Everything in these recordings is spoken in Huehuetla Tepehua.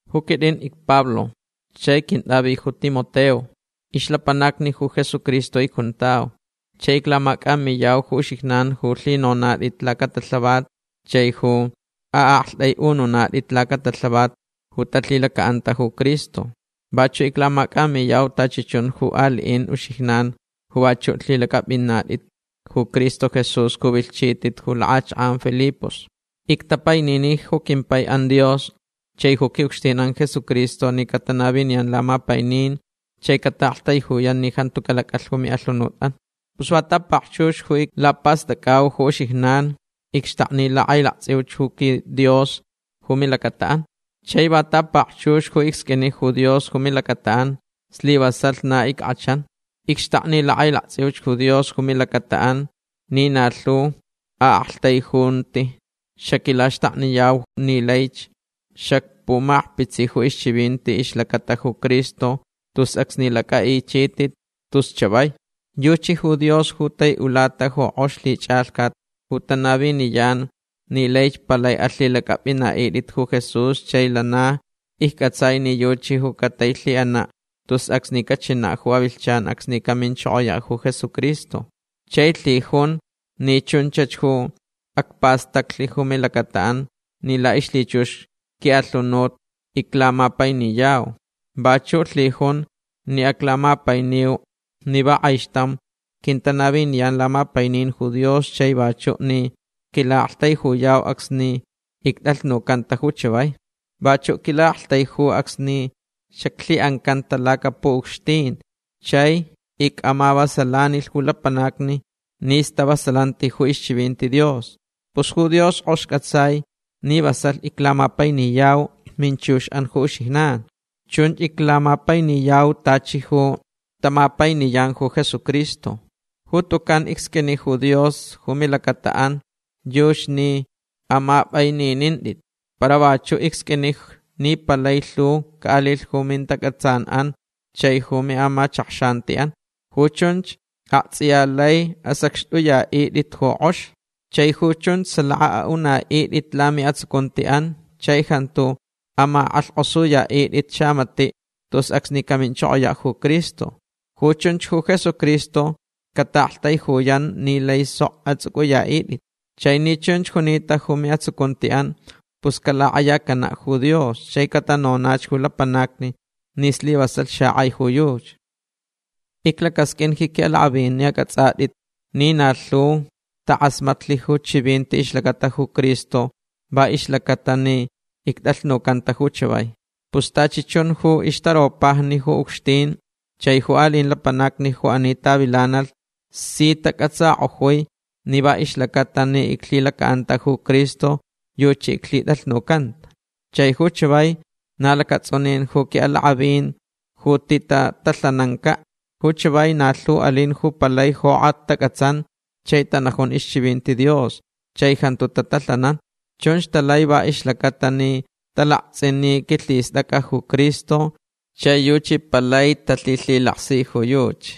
Ju quitʼin icPablo chai quintʼavi ju Timoteo. Ixlapanacni ju Jesucristo icjuntau. Chai iclamacʼamiyau ju uxijnan ju lhinonatʼit lacatalhavat chai ju aʼaktʼaiʼununatʼit lacatalhavat ju talhilacaʼanta ju Cristo. Vachuʼ iclamacʼamiyau tachi chun ju aliʼin uxijnan ju vachuʼ lhilacʼapʼinatʼit ju Cristo Jesús ju vilhchitʼit ju lakʼachakʼan Filipos. Ictapainini ju quimpaiʼan Dios chai ju quiʼucxtinʼan Jesucristo ni catanaviniyan lamapainin chai cataʼaktaijuyan ni jantu calacʼalh ju miʼalhunutʼan. Pus va ta pakchux ju iclapastʼacʼau ju uxijnan icxtakni lakʼailaktsʼiuch ju quiDios ju milacataʼan. Chai va ta pakchux ju icsqʼuini ju Dios ju milacataʼan slivasalh na ickʼachan. Icxtakni lakʼailaktsʼiuch ju Dios ju milacataʼan ni na lhu aʼaktaijunti xaquilaxtakniyau ni laich xacpumakpitsi ju chivinti ixlacata ju Cristo tus acsni lacʼaʼichitʼit tus chavai. Yuchi ju Dios ju taiʼulata ju kʼox lhichʼalhcat ju tanaviniyan ni laich palai alhilacʼapʼinaʼitʼit ju Jesús chai lana iccʼatsai ni yuchi ju catailhiʼanaʼ tus acsni cachinaʼ ju avilhchan acsni caminchokoyaʼ ju Jesucristo. Chai lhijunch ni chunchach acpastaclh ju milacataʼan ni laʼixlhichux quiʼalhunut iclamapainiyau. Vachuʼ lhijunch ni aclamapainiu ni va kʼaixtam quintanaviniyan lamapainin ju Dios chai vachuʼ ni quilaʼaktaijuyau acsni ictʼalhnucanta ju chavai. Vachuʼ quilaʼaktaijuch acsni xaclhiʼancanta lacapuʼucxtin chai icʼamavasalanilh ju lapanacni ni stavasalanti ju ixchivinti Dios. Pus ju Dios kʼox cʼatsai ni vasalh iclamapainiyau minchuxʼan ju uxijnan. Chun iclamapainiyau tachi ju tamapainiyan ju Jesucristo. Ju tucan icsqʼuini ju Dios ju milacataʼan yuchi ni amapʼaininintʼit. Para vachuʼ icsqʼuini ni palai lhu caʼalilh ju mintacʼatsanʼan chai ju miʼamachakxantiʼan. Ju chunch aktsʼiya laich asacxtʼuyaʼitʼit ju kʼox. Chai ju chunch salaka aʼunaʼitʼit lamiʼatsucuntiʼan chai jantu amakʼalhkʼosuyaʼitʼit xamatiʼ tus acsni caminchokoyaʼ ju Cristo. Ju chunch ju Jesucristo cataʼaktaijuyan ni lai sok atsʼucʼuyaʼitʼit. Chai ni chunch junita ju miʼatsucuntiʼan pus calakʼayacanaʼ ju Dios chai catanonach ju lapanacni ni slivasalh xakʼai ju yuchi. Iclacasqʼuinch ji quiʼalakʼavin ni acʼatsʼatʼit ni na lhu takʼasmatlh ju chivinti ixlacata ju Cristo va ixlacaʼatalh ni ictʼalhnucanta ju chavai. Pus tachi chun ju ixtaropajni ju ucxtin chai ju aliʼin lapanacni ju ani tavilanalh si tacʼatsakʼojui ni va ixlacaʼatalh ni iclhilacaʼanta ju Cristo yuchi iclhitʼalhnucanta. Chai ju chavai na lacatsʼunin ju quiʼalakʼavin ju titatalhanancaʼ. Ju chavai na lhu alin ju palai jokʼat tacʼatsan chai tanajun ixchivinti Dios chai jantu tatalhanan. Chunch talai va ixlacaʼatalh ni talaktsʼin ni quilhistʼacʼa ju Cristo chai yuchi palai talhilhilaksi ju yuchi.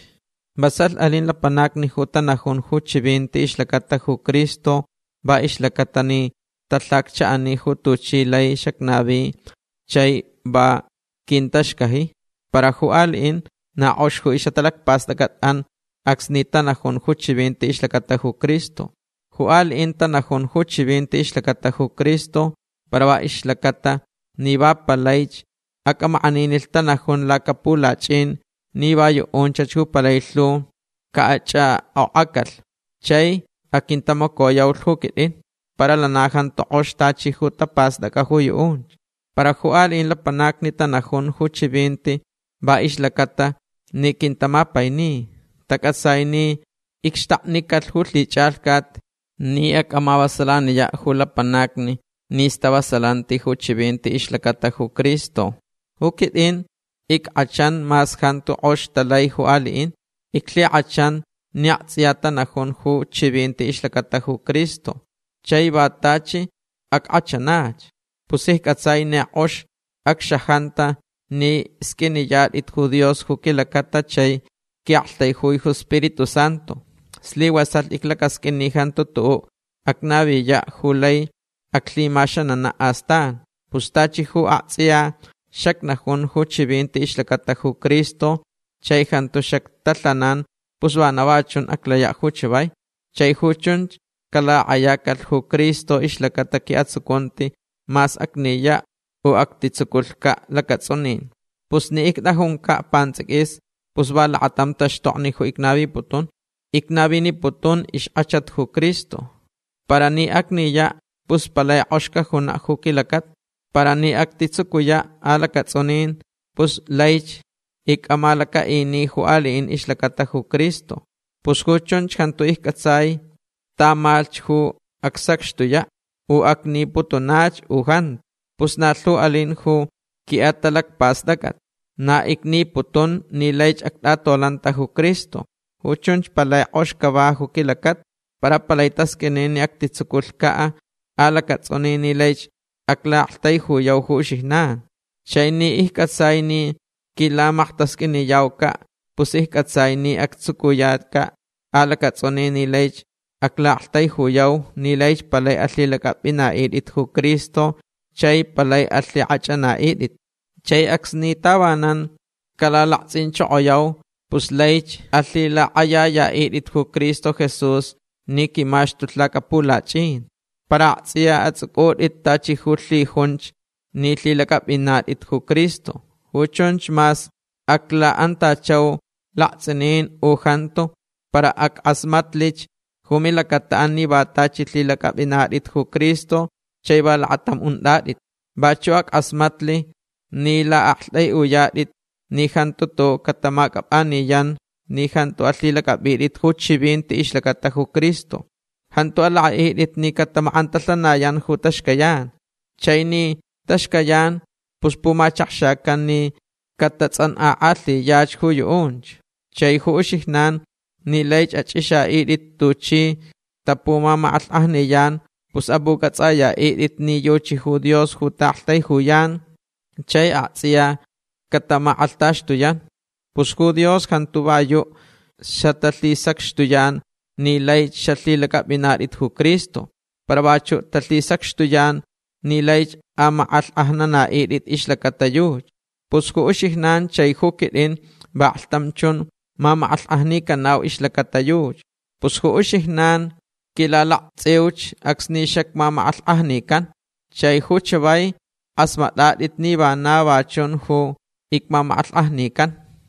Vasalh alin lapanacni ju tanajun ju chivinti ixlacata ju Cristo va ixlacaʼatalh ni talhacchaʼani ju tuchi lai xacnavi chai va quintaxcaji. Para ju aliʼin na kʼox ju ixʼatalacpastʼacʼatʼan acsni tanajun ju chivinti ixlacata ju Cristo. Ju aliʼin tanajun ju chivinti ixlacata ju Cristo para va ixlacaʼatalh ni va palaich acʼamakʼaninilh tanajun lacapulachʼin ni va yuʼunchach ju palai lhu caʼachʼakʼokʼacalh. Chai aquintamacoyaulh ju quitʼin. Para lana jantu kʼox tachi ju tapastʼacʼa ju yuʼunch. Para ju aliʼin lapanacni tanajun ju chivinti va ixlacaʼatalh ni quintamapaini. Tacʼatsai ni icxtaknicalh ju lhichʼalhcat ni acʼamavasalaniyaʼ ju lapanacni ni stavasalanti ju chivinti ixlacata ju Cristo. Ju quitʼin ickʼachan mas jantu kʼox talai ju aliʼin. Iclhikʼachan ni aktsʼiya tanajun ju chivinti ixlacata ju Cristo. Chai va tachi ackʼachanach. Pus iccʼatsai ni kʼox acxajanta ni sqʼuiniyatʼit ju Dios ju quilacata chai ni quiʼaktaijui ju Spiritu Santu. Slivasalh iclacasqʼuin ni jantu tuʼuʼ acnaviyaʼ ju lai aclhimaxananaʼ astan. Pus tachi ju aktsʼiya xacnajun ju chivinti ixlacata ju Cristo chai jantu xactalhanan pus vana va chun aclayaʼ ju chavai. Chai ju chunch calakʼayacalh ju Cristo ixlacata quiʼatsucunti mas acniyaʼ u actitsuculhcaʼ lacatsʼunin. Pus ni ictʼajuncaʼ pantsʼiquis pus va lakatam taxtokni ju icnaviputun. Va icnaviniputun ju ixkʼachat ju Cristo. Para ni acniyaʼ pus palai kʼox cajunaʼ ju quilacata. Para ni actitsucuyaʼ alacatsʼunin pus laich icʼamalacaʼini ju aliʼin ixlacata ju Cristo. Pus ju chunch jantu iccʼatsai tamalhch ju acsacxtuyaʼ. U acniputunach u jantu. Pus na lhu alin ju quiʼatalacpastʼacʼat. Na icniputun ni laich actʼatolanta ju Cristo. Ju chunch palai kʼox cava ju quilacata. Para palai tasqʼuini ni actitsuculhcaʼ alacatsʼunin ni laich aclaʼaktaijuyau ju uxijnan. Chai ni iccʼatsai ni quilamaktasqʼuiniyaucaʼ pus iccʼatsai ni actsucuyacaʼ alacatsʼunin ni laich aclaʼaktaijuyau ni laich palai alhilacʼapʼinaʼitʼit ju Cristo chai palai alhikʼachʼanaʼitʼit. Chai acsni tavanan calalaktsʼinchokoyau pus laich alhilakʼayayaʼitʼit ju Cristo Jesús ni quimaxtulh lacapulachʼin. Para aktsʼiya atsʼucʼutʼit tachi ju lhijunch ni lhilacʼapʼinatʼit ju Cristo. Ju chunch mas aclaʼantachau laktsʼinin u jantu para ackʼasmatlich ju milacataʼan ni va tachi lhilacʼapʼinatʼit ju Cristo chai va lakatam untʼatʼit. Vachuʼ ackʼasmatlich ni laʼaktʼaiʼuyatʼit ni jantu tuʼuʼ catamacʼapʼaniyan ni jantu alhilacʼapʼitʼit ju chivinti ixlacata ju Cristo. Jantu alakʼaʼitʼit ni catamakʼantalhanayan ju taxcayan. Chai ni taxcayan pus pumachakxacan ni catatsʼankʼakʼalhiyach ju yuʼunch. Chai ju uxijnan ni laich achʼixaʼitʼit tuchi tapumamakʼalhkʼajniyan pus apʼucʼatsʼayaʼitʼit ni yuchi ju Dios ju taʼaktaijuyan chai aktsʼiya catamakʼalhtaxtuyan. Pus ju Dios jantu va yuʼ xatalhisacxtuyan ni laich xalhilacʼapʼinaʼitʼit ju Cristo. Para vachuʼ talhisacxtuyan ni laich amakʼalhkʼajnanaʼitʼit ixlacata yuchi. Pus ju uxijnan chai ju quitʼin vaklhtam chun mamakʼalhkʼajnicanau ixlacata yuchi. Pus ju uxijnan quilalaktsʼiuch acsni xacmamakʼalhkʼajnican. Chai ju chavai kʼasmatʼatʼit ni vana va chun ju icmamakʼalhkʼajnican.